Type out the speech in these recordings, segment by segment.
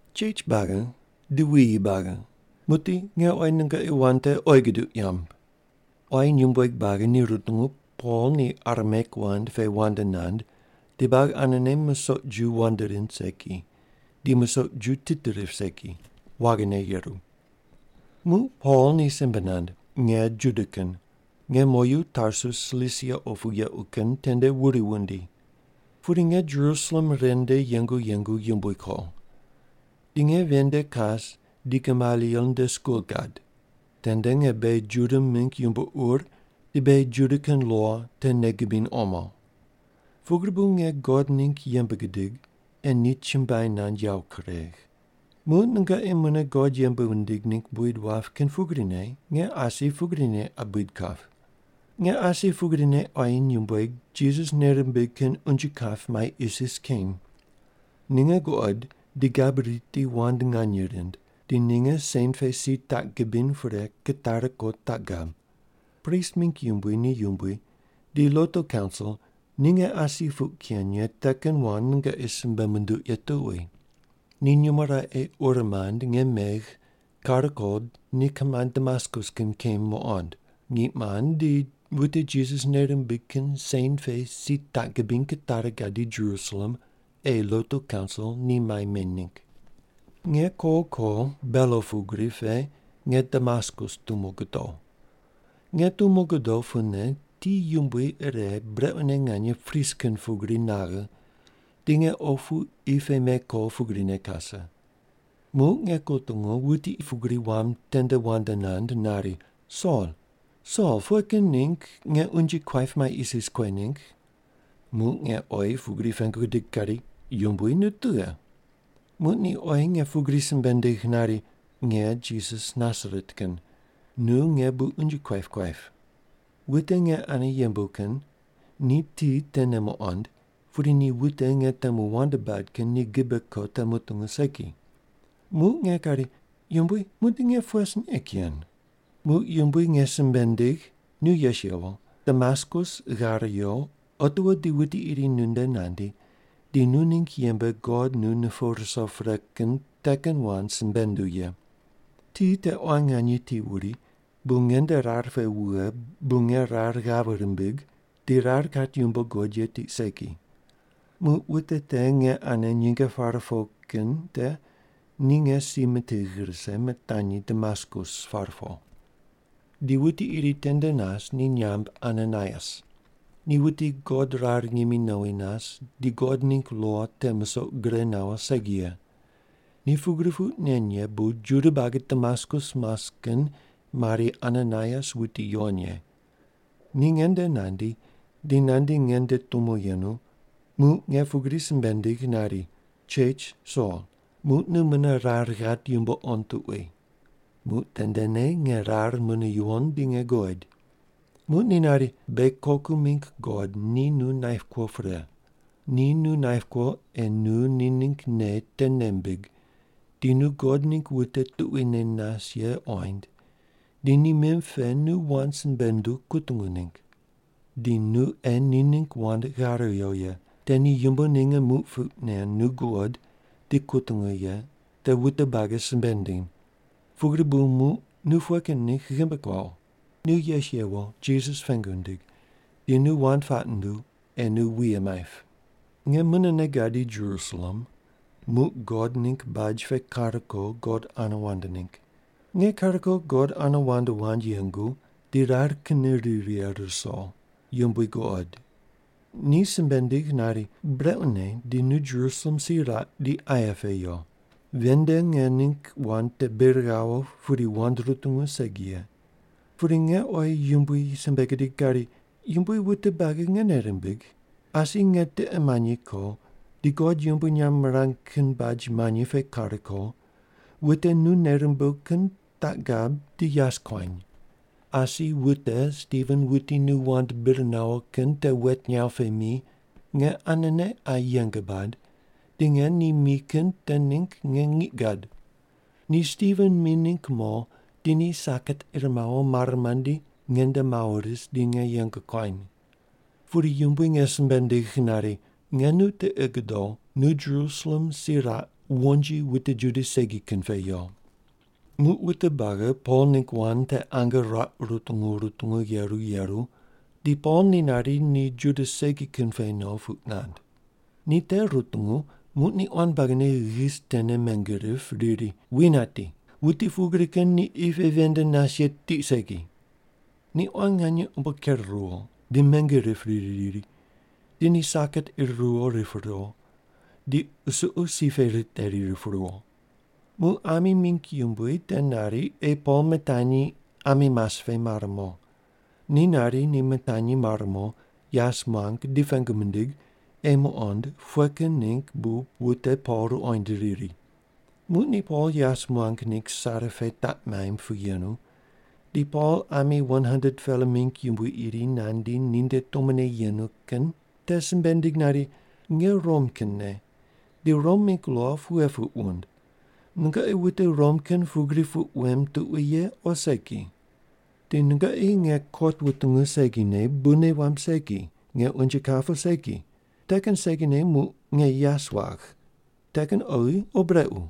“Chech buagi di wuyi buagi, muqdi nge oyi nungoqi wand te oyi guduq yamb.” Quayi nyumbueg buagi ni rutungu Pol ni Arameik wand pe wand nand di buagi anene musoq ju wand rind segi, di musoq ju tit rip segi, waghine yeru. Muq Pol ni simbe nand, “Nge Juda kin. Nge moyu Tarsus Silisia opu yequ kin tende wuri wundi. Pudi nge Jerusalem ren nde yengu yengu yumbui ko. Di nge ven nde kas di Gamaliel nde skul gad. Tende nge beghi Juda mingg yumbo ur di beghi Juda kin lo te nei gibiny omo. Pugri bu nge God ningg yembe gidig, ei ni chumbuai nand yawo kuregh. Muq nungoqi mune God yembe wundig ningg buid wap kin pugrine, nge asi pugrine qa buid kap. Nge asi pugrine quayi nyumbueg Jisas nei rimbig kin unje kap mai isis keny. Ninge guqod di gabui riti wand nganye rind, di ninge sen pe si taq gibiny pre kitari ko taq gab. Prist mingg yumbui ni yumbui di lotu kaunsil ni nge asi puq ken ye te kin wand nungoqi simbe munduq ye tuqui. Ni nyumo raqe ur mand nge megh kare ko ni kimand Damaskus kin kem muqond, ngiq mand, di wute Jisas nei rimbig kin sen pe si taq gibiny kitari gadi Jerusalem ei lotu kaunsil ni mai meny ningg. “Nge ko ko belo pugri pe nge Damaskus tumo godo. Nge tumo godo pune ti yumbui ire brequne nganye pris kin pugri naghe, di nge opu qi pe mei ko pugrine kase. Muq nge kutungu, wuti pugri wam tende wand nand nari, ‘Sol, Sol pughe kin ningg nge unje kuaip mai isis kuegh ningg?’ “Muq nge oyi pugri pengu gidig kari, ‘Yumbui, nu tughe?’ “Muq ni oyi nge pugri simbe nindigh nari, ‘Nge Jisas Nasaret kin. Nu nge bu unje kuaip kuaip.’ Wute nge ane yembu kin ni ti tene muqond, pudi ni wuti nge temu wand bad kin ni gibe ko te mutungu segi. “Muq nge kari, ‘Yumbui, muqdi nge pughe sin ei ken?’ “Muq Yumbui nge simbe nindigh, ‘Nu yes yewo, Damaskus ghar yo, otiwo di wuti iri nunde nandi, di nu ningg yembe God nu nupuw ruso pre kin te kin wand simbe nunduw ye.’ “Ti te quan nganye ti wuri, bu nge nde rar pe wughe bu nge rar ghave rimbigh di rar kat yumbo guqod ye tiq segi. Muq wute te nge ane nyinge pare po kin te ni nge si mitigh rise, mitanyi Damaskus par po. “Di wuti iri tende nas ni nyamb Ananaias. Ni wuti God rar ngimi nowi nas di God ningg lo te musoq gure nawo segi ye. Ni pugri puq nen ye bu Juda buagi Damaskus mas kin mari, ‘Ananaias wuti yuwon ye.’ Ni nge nde nandi, di nandi nge nde tumo yenu, muq nge pugri simbe nindigh nari, ‘Chech Sol, muq nu mune rar ghat yumbo qond tuqui.’ Muq tendene nge rar mune yuwon di ni guqoid. “Muq ni nari, ‘Beghi koku mingg God ni nu naip kuo pre. Ni nu naip kuo ei nu ni ningg nei te nei mbig, di nu God ningg wuti tuquine nas ye qoind, di ni mim pe nu wand simbe nunduw kutungu ningg. Di nu ei ni ningg wand ghare yo ye, te ni yumbo ninge muq puq nen nu guqod di kutungu ye te wute buagi simbe ndiny. Pugri bu muq nu pughe kin ningg ghimbi kuawo? Nu yes yewo Jisas pengu ndig, di nu wand puaq nunduw, ei nu wuye maip.’ “Nge munene gadi Jerusalem, muq God ningg baj pe kar ko God ane wand ningg. Nge kar ko God ane wand wand yengu di rar kinne ri righe ruso, Yumbui guqoid. Ni simbe nindigh nari, ‘Brequne di nu Jerusalem si raq di aye pe yo. Ven nde nge ningg wand te bir ghawo pudi wute rutungu segi ye.’ “Pudi nge oyi Yumbui simbe gidig kari, ‘Yumbui wute buagi nge nei rimbigh. Asi nge tiqe manyi ko, di God yumbui nyamb mirang kin baj manyi pe kar ko, wute nu nei rumbuw kin taq gab di yas kuany. Asi wute Stiven wuti nu wand bir nawo kin te wet nyaw pe mi, nge anene qa yeng bad di nge ni mi kin te ningg nge ngiq gad. Ni Stiven mi ningg mo di ni saket ir mawo mare mandi nge nde mawo ris di nge yeng kuany.’ “Pudi Yumbui nge simbe nindigh nari, ‘Nge nu tiqi gudow, nu Jerusalem si raq wonji wute Juda segi kin pe yo’.” Muq wute buagi Pol ningg wand te ange ruaq rutungu rutungu yeru yeru di Pol ni nari ni Juda segi kin pe no puq nand. Ni te rutungu muq ni quan buagine ghis tene menge rip riri, “Wi nati, wuti pugri kin ni qi pe ven nde nas ye tiq segi.” Ni quan nganye umbo ker ruwo di menge rip riri riri, di ni saket ir ruwo rip ruwo, di qusuqu si pe riteri rip ruwo. Muq ami mingg yumbui te nari ei Pol mitanyi ami mas pe mar mo. Ni nari ni mitanyi mar mo yas muang di pengu mindig ei muqond pughe kin ningg bu wute Pol ruqoind riri. Muq ni Pol yas muang ningg sare pe taq maimb pu yenu, di Pol ami 100-pela mingg yumbui iri nandi ninde tumone yenu kin te simbe nindig nari, “Nge Rom kinne, di Rom mingg lo pughe puq wund, nungoqi wute Rom kin pugri puq wem tuqui ye o segi? Di nungoqi nge kot wutungu segine bu nei wamb segi nge unje kap o segi, te kin segine muq nge yas wagh, te kin oghi o brequ?”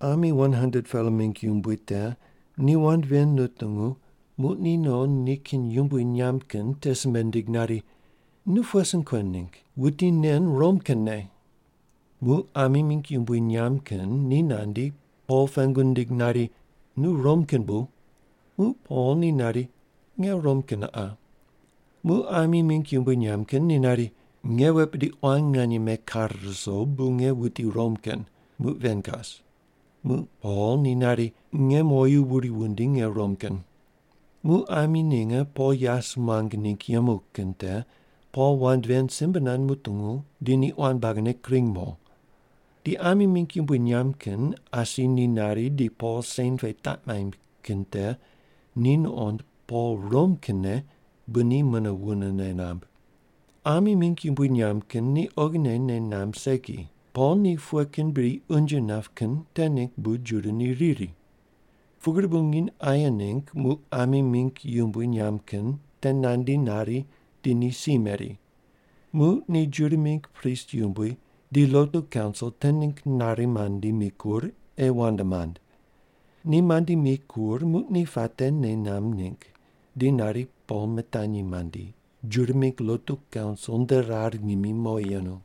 Ami 100-pela mingg yumbui te ni wand ven nutungu, muq ni no nikin yumbui nyamb kin te simbe nindig nari, “Nu pughe sin kuen ningg? Wuti nen Rom kinne.” Muq ami mingg yumbui nyamb kin ni nandi, Pol pengu nindig nari, “Nu Rom kin bu?” Muq Pol ni nari, “Nge Rom kin qa.” Muq ami mingg yumbui nyamb kin ni nari, “Nge wet bidi quan nganye mekare ruso, bu nge wuti Rom kin, muq ven kas.” Muq Pol ni nari, “Nge moyu wuri wundi nge Rom kin.” Muq ami ninge Pol yas muang ningg yemu kin te Pol wand ven simbe nand mutungu, di ni quan buagine kring mo. Di ami mingg yumbui nyamb kin asi ni nari di Pol sen pe taq maimb kin te ni nuqond Pol Rom kinne bu ni mune wunene namb. Ami mingg yumbui nyamb kin ni oghine nei namb segi, Pol ni pughe kin bri unje nap kin te ningg bu Juda ni riri. Pugri bu nginy aye ningg muq ami mingg yumbui nyamb kin te nandi nari di ni si meri. Muq ni Juda mingg prist yumbui di lotu kaunsil te ningg nari mandi mikur ei wand mand. Ni mandi mikur muq ni puate nei namb ningg di nari Pol mitanyi mandi, Juda mingg lotu kaunsil nde rar ngimi mowi yenu.